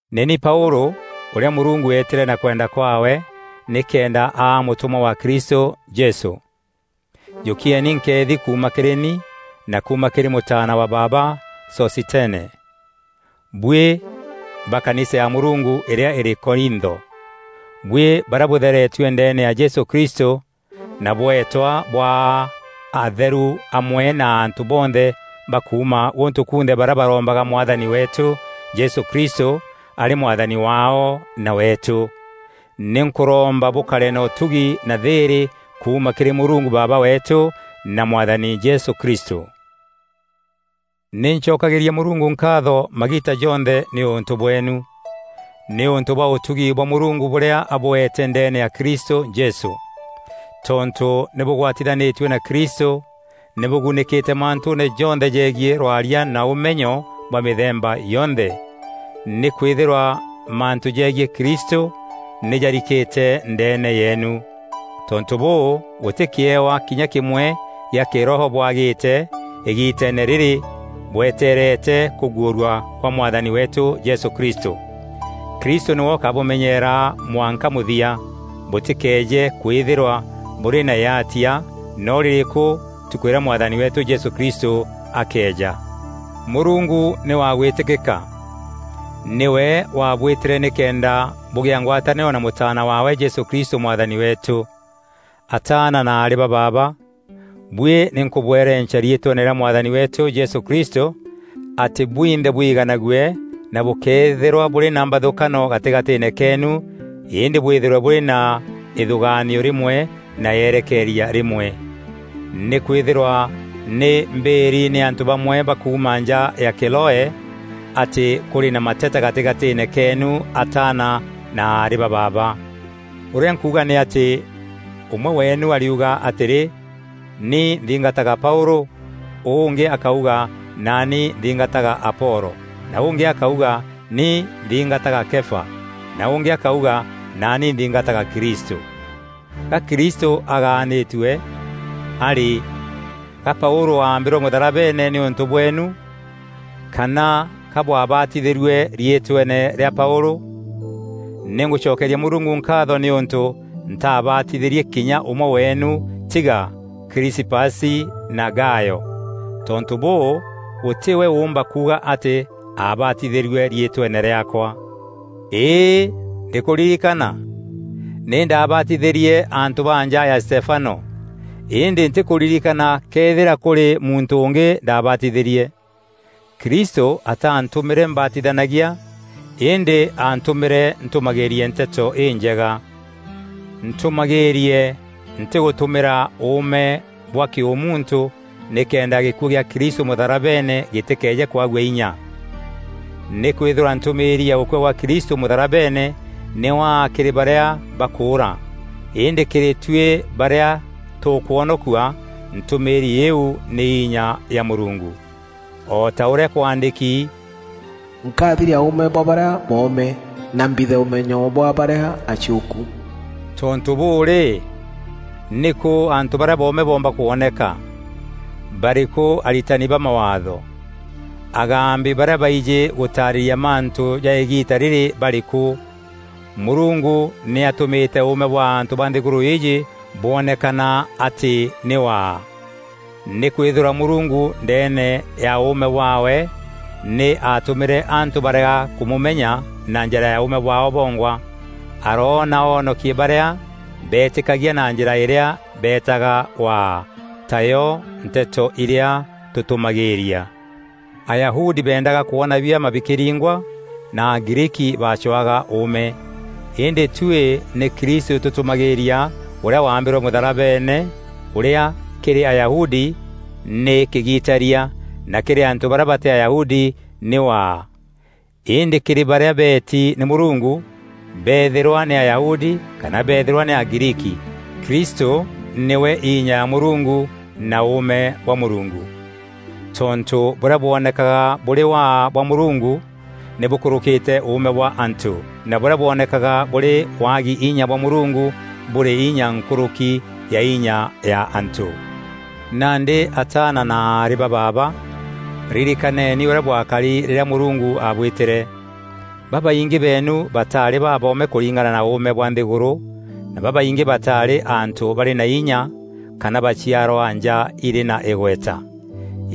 Nî ni Paûlû ûrîa Mûrungu eetîre na kwenda kwaawe nîkenda aa mûtûmwa wa Kristû Jesû. Jûkieni nkeethi kuuma kîrî ni na kuuma kîrî mûtaana wa baaba Sosithene, buî ba kanisa ya Mûrungu îrîa îrî Korintho. Buî barîa bûtheretue ndeene ya Jesû Kristû na bweetwa bwaa atheru amwe na antû bonthe ba kuuma gûntû kunthe barîa barombaga Mwathani weetû Jesû Kristû arî Mwathani waao na weetû. Nî nkûromba bûkare na ûtugi na thîîrî kuuma kîrî Mûrungu Baaba weetû na Mwathani Jesû Kristû. Nî ncokagîria Mûrungu nkaatho magiita jonthe nîûntû bweenu nîûntû bwa ûtugi bwa Mûrungu bûrîa abûeete ndeene ya Kristû Jesû. Tontû nî bûgwatithanîtue na Kristû nî bûgunîkîte mantûûne jonthe jegiî rwaria na ûmenyo bwa mîthemba yonthe. Nîkwîthîrwa mantû jegiî Kristû nî jarikîte ndeene yeenu. Tontû bûû gûtî kîewa kinya kîmwe gîa kîroho bwagîte îgiiteene rîrî bwetereete kûguûrwa kwa Mwathani weetû Jesû Kristû. Kristû nîwe ûkabûmenyeera mwanka mûthia, bûtîkeeje kwîthîrwa bûrî na yaatia noo rîrîku ntukû îrîa Mwathani weetû Jesû Kristû akeeja. Mûrungu nî wa gwîtîkîka. Nîwe waabwîtîre nîkenda bûgîa ngwatanîro na Mûtaana waawe Jesû Kristû Mwathani weetû. Ataana na aarî ba baaba, buî nî nkûbwerenca riîtweene rîa Mwathani weetû Jesû Kristû atî bwinthe bwiiganague na bûkeethîrwa bûrî na mbathûkano gatîgatîîne keenû îndî bwîthîrwe bûrî na îthûgaanio rîmwe na yerekeria rîmwe. Nîkwîthîrwa nî mbîîri nî antû bamwe ba kuuma nja ya Kiloe atî kûrî na mateta gatîgatîîne keenu ataana na aarî ba baaba. Ûrîa nkûûga nî atî, ûmwe weenu ariuga atîrî, “Ni nthingataga Paûlû,” ûngî akauga, “Naani nthingataga Apolo,” na ûngî akauga, “Ni nthingataga Kefa,” na ûngî akauga, “Naani nthingataga Kristû.” Ga Kristû agaanîtue? A rî, ga Paûlû aambîrwe mûtharabeene nîûntû bweenu? Kana ka bwabatithîrue riîtweene rîa Paûlû? Nî ngûcokeria Mûrungu nkaatho nîûntû ntaabatithîrie kinya ûmwe weenu tiga Krisipasi na Gayo. Tontû bûû, gûtî we ûûmba kuuga atî aabatithîrue riîtweene rîaakwa. Îî, ndîkûririkana! Nî ndabaatithîrie antû ba nja ya Stefano; îndî ntîkûririkana këethîra kûrî muntû ûngî ndabaatithîrie. Kristû ataantûmîre mbatithanagia îndî antûmîre ntûmagîîrie Nteto Înjega. Ntûmagîîrie ntîgûtumîra ûûme bwa kîûmuntû nîkenda gîkuû kîa Kristû mûtharabeene gîtîkeeje kwagua înya. Nîkwîthîrwa ntûmîîri ya gûkua gwa Kristû mûtharabeene nî waa kîrî barîa bakûûra îndî kîrî tuî barîa tûkwonokua, ntûmîîri îîu nî inya ya Mûrungu. O ta ûrîa kwaandîki, “Nkathiria ûûme bwa barîa boome, na mbithe ûmenyo bwa barîa aciûku.” Tontû bûû rî, nîkû antû barîa boome boomba kwoneka? Barîkû aritani ba Mawaatho? Agambi barîa baijî gûtaarîria mantû ja îgiita rîrî barîkû? Mûrungu nî atûmîte ûûme bwa antû ba nthîgûrû îîjî bwonekana atî nî waa. Nîkwîthîrwa Mûrungu ndeene ya ûûme bwaawe, nî atûmîre antû barega kûmûmenya na njîra ya ûûme bwaao bongwa; aroona oonokie barîa beetîkagia na njîra irîa beetaga Waa, tayo nteto irîa tûtûmagîîria. Ayahudi beendaga kwona biama bikîringwa na Agriiki bacwaga ûûme. Îndî tuî nî Kristû tûtûmagîîria ûrîa waambîrwe mûtharabeene ûrîa kîrî Ayahudi nî kîgitaria na kîrî Antû barîa batî Ayahudi nî waa. Îndî kîrî barîa beeti nî Mûrungu, beethîrwa nî Ayahudi kana beethîrwa nî Agriiki, Kristû nîwe inya ya Mûrungu na ûûme bwa Mûrungu. Tontû bûrîa bwonekaga bûrî waa bwa Mûrungu, nî bûkûrûkîte ûûme bwa antû na bûrîa bwonekaga bûrî waagi inya bwa Mûrungu bûrî inya nkûrûki ya inya ya antû. Nandî ataana na aarî ba baaba, ririkaneni ûrîa bwakari rîrîa Mûrungu aabwîtîre. Babaingî beenu bataarî baboome kûringana na ûûme bwa nthîgûrû na babaingî bataarî antû barî na inya kana baciarwa nja irî na îgweta.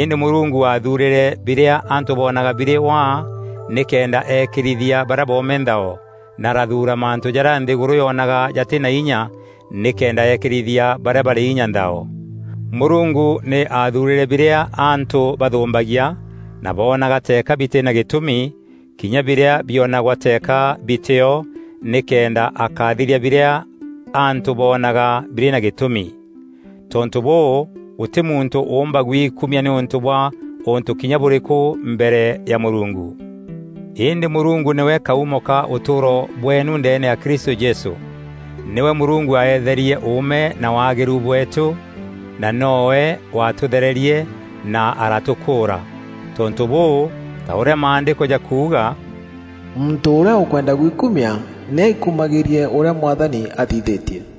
Îndî Mûrungu aathuurîre birîa antû bonaga birî waa nîkenda eekîrithia barîa boome nthao na arathuura mantû jarîa nthîgûrû yonaga jatî na inya nîkenda eekîrithia barîa barî inya nthao. Mûrungu nî aathuurîre birîa antû bathûmbagia na boonaga teeka bitî na gîtûmi, kinya birîa bionagwa teeka bitîo nîkenda akathiria birîa antû boonaga birî na gîtûmi. Tontû bûû, gûtî muntû ûûmba gwikumia nîûntû bwa ûntû kinya bûrîkû mbere ya Mûrungu. Îndî Mûrungu nîwe kaûmo ka ûtûûro bweenu ndeene ya Kristû Jesû. Nîwe Mûrungu aeetherie ûûme na waagîru bweetû, na noowe waatûthererie na aratûkûûra. Tontû bûû ta ûrîa Maandîko jakuuga, “Muntû ûrîa ûkwenda gwikumia nî aikumagîîrie ûrîa Mwathani athithîtie.”